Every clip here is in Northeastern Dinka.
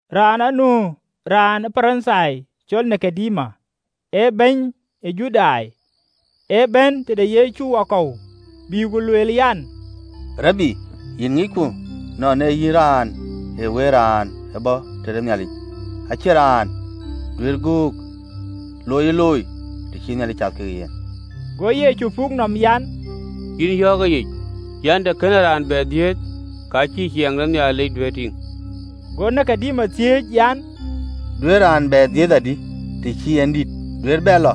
Raan anu raan ë Parithai, cɔl Nikodemo, ee bɛ̈ny ë Judai. Ë bɛ̈n tëde Yecu wakɔ̈u, bï ku lueel an, “Rabi, yïn ŋicku nɔn ee yïn raan ee wëët raan ë bɔ̈ tëde Nhialic: acïn raan duëër göök loiyë looi, të cïï Nhialic cath ke yen.” Go Yecu puk nɔm an, “Yïn yɔ̈ɔ̈k ëyic an, të kënë raan bɛ dhiëëth, ka cïï ciɛɛŋ de Nhialic duëër tïŋ.” Go Nikodemo thiëëc an, “Duëërë raan bɛ dhiëëth adï, të cï en dït? Duëër bɛ lɔ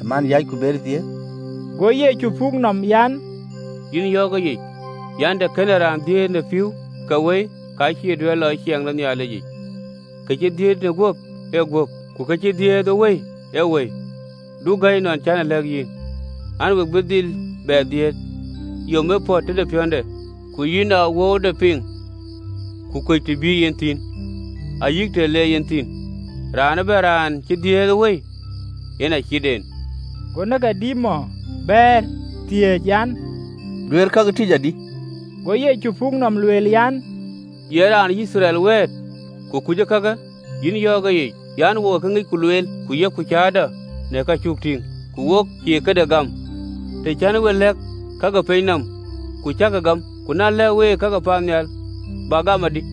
ë man yäc, ku beyë dhiëëth!” Go Yecu puk nɔm an, “Yïn yɔ̈ɔ̈k ëyic an, të kënë raan dhiëëth në pïïu kekë wëi, ka cïï duëër lɔ ë ciɛɛŋ de Nhialicic. Kë cï dhiëëth në guöp ee guöp, ku ke cï dhiëëth ë Wëi ee wëi. Du gäi nɔn cän e lɛ̈k yïn an, we bï dhil bɛ dhiëëth. Yom ee pɔ̈t tëde piɔ̈nde, ku yïn ee awööude piŋ, ku kuc të bï yen thïn, ayï të le yen thïn: raan ëbɛ̈n raan cï dhiëëth ë Wëi yen acït en.” Go Nikodemo bɛ̈ɛ̈r, thiëëc an, “Duëër kakë bɛ̈n adï?” Go Yecu puk nɔm, lueel an, “Ye raan ë Yithriɛl wɛ̈ɛ̈t, ku kuc kakë?” Yïn yɔ̈ɔ̈k ëyic an, “Wok ee kë ŋicku lueel ku yok cäätɔɔ në ka cuk tïŋ, ku wek cïï këda ee gam. Të cän week lɛ̈k ka ke piny nɔm, ku cäkï gam, ku na lɛ̈k week ka ke paannhial, bäk gam wäkdï?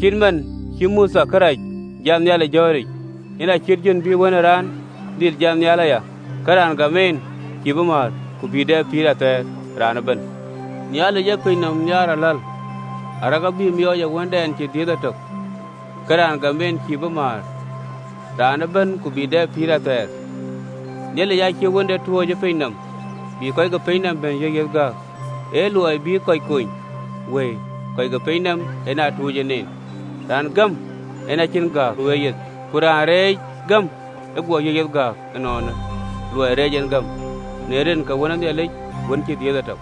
Acït man cï Mothe kërac jat nhial ë jɔ̈ɔ̈ric, yen acït jön bï Wën ë Raan dhil jat nhial aya: ke raan gam ɛn cïï bï määr, raan ëbɛ̈n, ku bï dɛ pïïr athɛɛr. Nhialic ë piny nɔm nhiaar aläl, arëk abï miɔɔc ë Wëndɛn cï dhiëëth etök, ke raan gam en cïï bï määr, raan ëbɛ̈n, ku bï dɛ pïïr athɛɛr. Nhialic aacïï Wënde tuuc ë piny nɔm, bï kɔc ke piny nɔm yiëk yiëth gääk, ee luɔi bï kɔc ke piny nɔm kony wëi, en ë tuuc en en. Raan gam en acïn gääk nu ë yeyeth: ku raan reec gäm, ë guɔ yiëk yeth gääk ënɔɔnë, luɔi reec en gäm në rin ke Wën ë Nhialic, wën cï dhiëëth etök.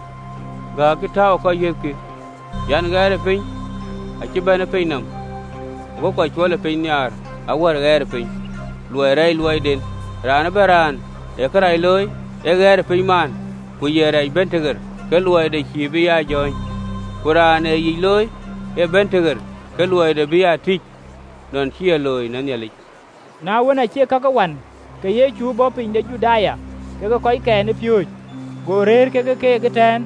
Gääk cï tääu ë kɔc yiëth kï, ɣɛɛrëpiny ëbɛ̈n ë piny nɔm, go kɔc cuɔlëpiny nhiaar awär ɣɛɛrëpiny, ë luɔi rɛɛcë luɔiden. Raan ëbɛ̈n raan ë kërac looi, ee ɣɛɛrëpiny maan, ku ye rɛɛc bɛ̈n tëɣer, ke luɔide cïï bï aa jɔ̈ɔ̈ny. Ku raan ee yic looi ee bɛ̈n tëɣer, ke luɔide bï aa tïc, nɔn cï e looi në Nhialic. Na wën, acï kakë wan, ke Yecu bɔ̈ piny de Juda kekë kɔckɛn ë piööcë, go rëër ke keek ëtɛ̈ɛ̈n,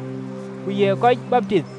ku ye kɔc baptith.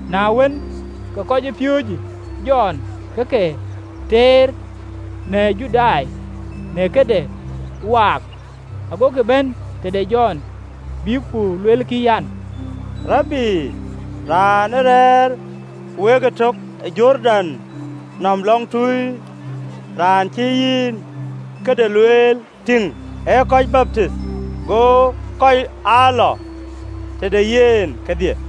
Na wën, ke kɔcpiööcë Jɔn ke ke teer në Judai në këde waak. Agokï bɛ̈n tëde Jɔn, bïk ku luelkï an, “Rabi, raan ë rɛ̈ɛ̈r wek ëtök ë Jordan nɔm lɔŋtui, raan cï yïn këde lueel, tïŋ, ee kɔc baptith, go kɔc aa lɔ tëde yen kedhie!”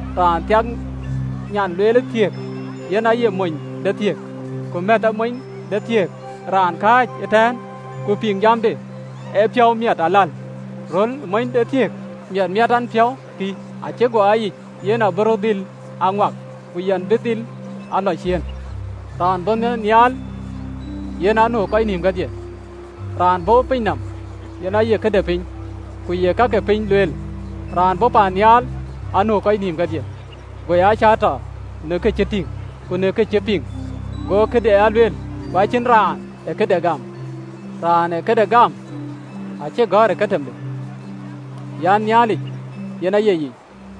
Raan thiak nyan lueelë thiëëkë, yen aye monythiëk: ku mɛ̈thë monythiëk, raan kääc ëtɛ̈ɛ̈n ku piŋ jamde, ee piɔ̈u miɛt aläl ë röl ë monythiëk: miɛt miɛt ɛn piɔ̈u kï, acï guɔ aa yic. Yen abï rɔt dhil aa ŋuak, ku yɛn bï dhil aa lɔ ciëën.” Raan bɔ̈ paannhial yen anu ë kɔc nïïm kedhie. Raan bɔ̈ ë piny nɔm, yen aye këde piny, ku ye ka ke piny lueel: raan bɔ̈ paannhial anu ë kɔc nïïm kedhie. Go ya cäätɔ në ka cï tïŋ ku në ka cï piŋ, go këde aa lueel, ku acïn raan ë këde gam. Raan ë këde gam, acï gɔ̈ɔ̈r ë katimde an, Nhialic yen aye yic.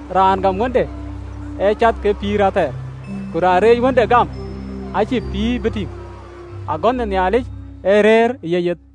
Raan gam Wënde ee cath ke pïïr athɛɛr, ku raan reec Wënde gam, acïï pïïr bï tïŋ, agönh ë Nhialic ee rëër ë yeyeth.